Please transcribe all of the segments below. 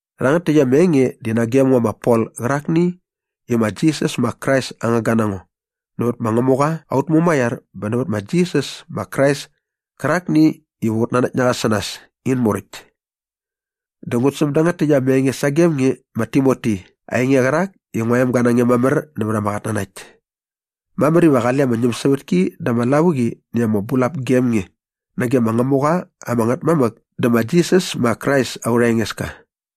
Rhangät täkt ama enge di nagem ngo ma Pol qärakni i ma Jisas ma Krais aa ngangga na ngo nävät ma Ngämuqa aut Mumaiar bä nävät ma Jisas ma Krais kärakni iva ut nanakt na qa sä nas in muräkt. Dä ngut säm dangät täkt ama enge sagem nge ma Timoti ainge qärak i ngua emga na nge mamär nävät ama qatnanakt. Mamär iva qale ama ñämsävätki dä ama lavuqi näkt ama bulap gem nge nage ma Ngämuqa ama Ngätmamäk dä ma Jisas ma Krais aurha Engeska.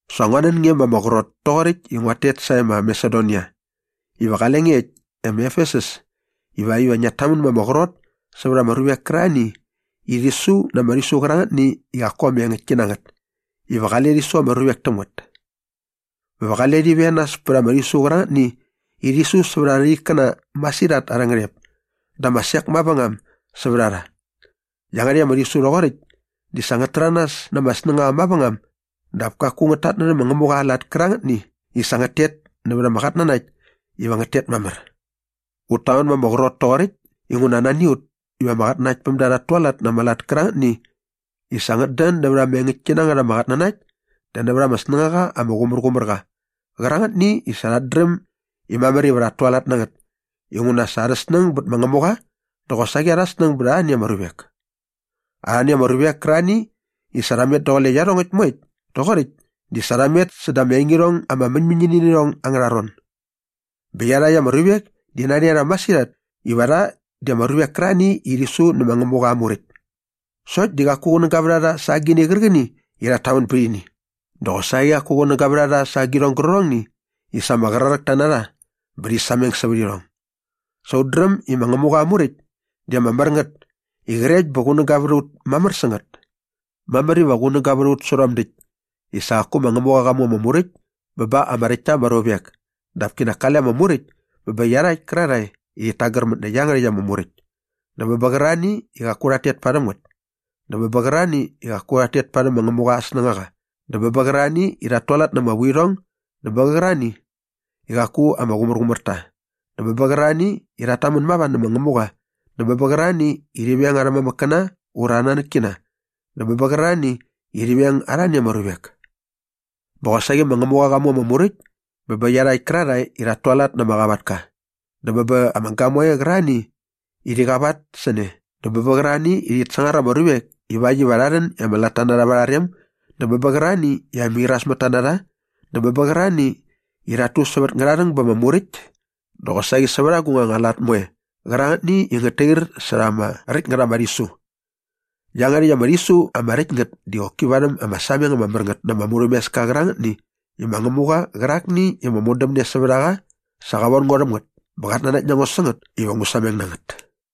Sa ngua nän nge ma ama qrot toqoräkt i nguat tet sae ma Masedonia iva qale nge äkt e ma Efesus ivakt iva ngiat tamän ma ama qrot sävät ama ruvek kärarhani i rhi su na ama rhisu qärangätni i qaku ama engäktki na ngät iva qale rhi su ama ruvek täm ngät bä va qale rhi venas pät ama rhisu qärangätni i rhi su sävät arha ikkäna masirhat arhä ngärhep dä ama sek mavängam sävät a rha. Iangärhäkt ama rhisu rhoqoräkt di sa ngät täranas na ama snängaqa mavängam dap kaku ngät tatnärhä ma Ngämuqa aa lat kärangätni i sa ngät tet nävät ama qatnanakt iva ngät tet mamär. Ut tamän ma ama qrot toqoräkt inguna nani a ut iva ama qatnanaktpämda rhat tualat na ama lat kärangätni i sa ngät dän nävät ama engäktki na ngät ama qatnanakt dä nävät ama snängaqa ama qumärqumär qa qärangätni i sa rhat dräm i mamär iva rhat tualat na ngät inguna sa arha snäng bät ma Ngämuqa dä qosaqi arha snäng bät arhani ama ruvek. Arhani ama ruvek kärarhani i sa rha met daqule iarhongäkt moekt toqoräkt di sa rha met säda ama engirhong ama mäñmäñini nä irhong angärha ron. Bä iarhakt ama ruvek di nani a rha masirhat iva rha di ama ruvek kärarhani i rhi su nä ma Ngämuqa aa Muräkt. Sokt di qaku qunäga vät a rha sa agini qärqäni i rhat tamän bät ini dä qosaqi qaku qunäga vät a rha sa agirhong gärqärhongni i sa ama qraräkta na rha bä rhi sameng sävät irhong. Sa ut dräm i ma Ngämuqa aa Muräkt di ama mär ngät i qrekt bä qunäga vät a ut mamär sä ngät. Mamär iva qunäga vät a ut sä rhom däkt i sa qaku ma Ngämuqa qa mu ama Muräkt bä ba ama räkt ta ama ruvek dap kinak kale ama Muräkt bä bä iarhakt kärarhae i rhit tagärmät nä iangärhäkt ama Muräkt dä bä bä qärarhani i qaku rhat tet parhäm ngät dä bä bä qärarhani i qaku rhat tet parhäm ma Ngämuqa aa snängaqa dä bä bä qärarhani i rhat tualat na ama vuirhong dä bä bä qärarhani i qaku ama qumärqumär ta dä bä bä qärarhani i rhat tamän mava nä ma Ngämuqa dä bä bä qärarhani i rhi veng arhä mamäkkäna ura arhä nanäkkina dä bä bä qärarhani i rhi veng arhani ama ruvek. Bä qosaqi ma Ngämuqa qa mu ama Muräkt bä bä iarhakt kärarhae i rhat tualat na ama qavatka dä bä ba ama gamoe qärarhani i rhi qavat sä ne dä bä bä qärarhani i rhit sangar ama ruvek ivakt iva rha rhän i ama latta va arha rem dä bä bä qärarhani i ama irasmätta na rha dä bä bä qärarhani i rhat tu sävät ngärharhäng ba ama muräkt dä qosaqi sävät agung anga lat moe qärangätni i ngät tair särha ama räkt ngät ama rhisu. Iangärhäkt ama rhisu ama räkt ngät di qoki varhäm ama sameng ama mär ngät na ama murhämeska qärangätni i ma Ngämuqa qärakni i ama modämne sävät a qa sa qa von ngo rhäm ngät bä qat nanakt na ngo sä ngät iva ngu sameng na ngät.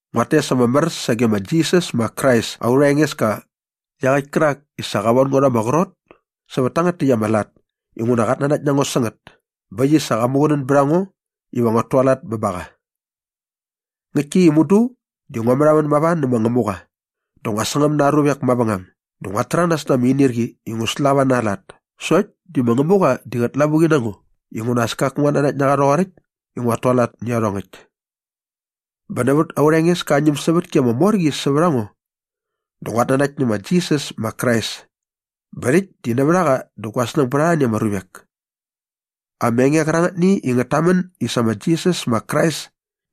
Nguat tes ama mär sage ma Jisas ma Krais aurha Engeska iaqäkt kärak i sa qa von ngo rha ama qrot sävät tangät täkt ama lat inguna qat nanakt na ngo sä ngät bä äkt i sa qa muqunän bät a ngo iva nguat tualat bä ba qa. Ngäktki i mudu di ngua märhamän mava nä ma Ngämuqa dä ngua sangäm na aa ruvek mavängam dä nguat täranas na ama inirqi i ngu slava na aa lat sokt di ma Ngämuqa di qät lavuqi na ngo inguna as kaku nguat nanakt na qa rhoqoräkt i nguat tualat nä iarhongäkt. Bä nävät aurha Engeska aa ñämsävätki ama mor qi sävät a ngo dä nguat nanakt nä ma Jisas ma Krais bä rhäkt di nävät a qa dä gua snäng bät arhani ama ruvek. Ama enge qärangätni i ngät tamän i sa ma Jisas ma Krais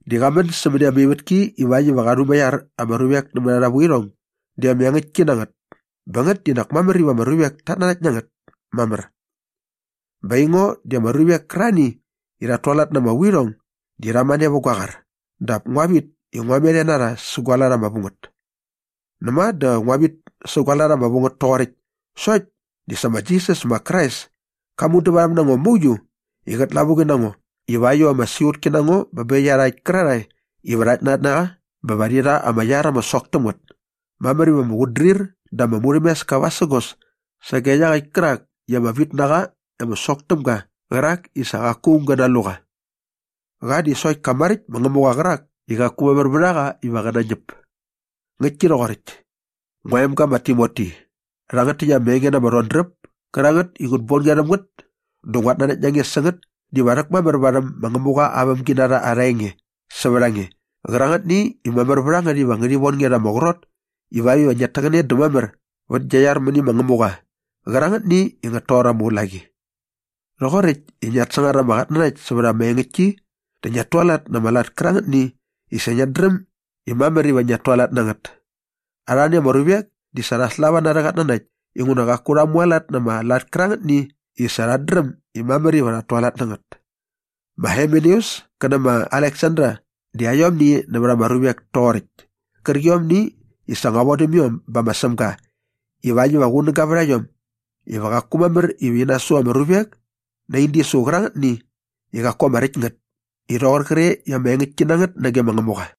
di qa män sämäni ama ivätki ivakt iva qa rhumaiar ama ruvek nämät arha vuirhong di ama engäktki na ngät bä ngät di nak mamär iva ama ruvek tat nanakt na ngät mamär. Bä aingo di ama ruvek kärarhani i rhat tualat na ama vuirhong di rha mane vät gua qar dap ngua vit i ngua met e na rha sä gua lat ama vu ngät. Näma dä ngua vit sä gua lat ama vu ngät toqoräkt sokt di sa ma Jisas ma Krais ka mudävarhäm na ngo mauiu i qät lavuqi na ngo ivakt iva ama siqutki na ngo bä bä iarhakt kärarhae iva rhat nanakt na qa bä va rhi rha ama iar ama sok täm ngät. Mamär iva ama qutdrir dä ama murhämeska vasägos sage iaqäkt kärak i ama vitnaqa ama sok täm ga qärak i sa qaku aung gä nalu qa. Qa di sokt ka maräkt ma Ngämuqa qärak i qaku mamär vät a qa iva qä nañäp. Ngäktki rhoqoräkt. Ngua emga ma Timoti, rhangät täkt ama enge na ama rhodräp kärangät i ngut bon nge rhäm ngät dä nguat nanakt na nge sä ngät diva rhäkmamär varhäm ma Ngämuqa aa vämginarha arha enge sävät a nge qärangätni i mamär vät a ngät iva ngärhi von nge rha ama qrot ivakt iva ngiat täqäne dä mamär vät gia iar mäni ma Ngämuga qärangätni i ngät toqor ama ulaqi rhoqoräkt i ngiat sangar ama qatnanakt sävät ama engäktki dä ngiat tualat na ama lat kärangätni i sa ngiat dräm i mamär iva ngiat tualat na ngät. Arhani ama ruvek di sa rha slava na arhä qatnanakt inguna qaku rha mualat na ama lat kärangätni i sa rhat dräm i mamär iva rhat tualat na ngät. Ma Himeneus kä nä ma Aleksander di aiomni nävät ama ruvek toqoräkt kärqiomni i sa ngua vodäm iom bä ma Sämga ivakt iva qunäga vät a iom iva qaku mamär iva ini su ama ruvek na in disu qärangätni i qaku ama räkt ngät i rhoqor qre i ama engäktki na ngät nage ma Ngämuqa.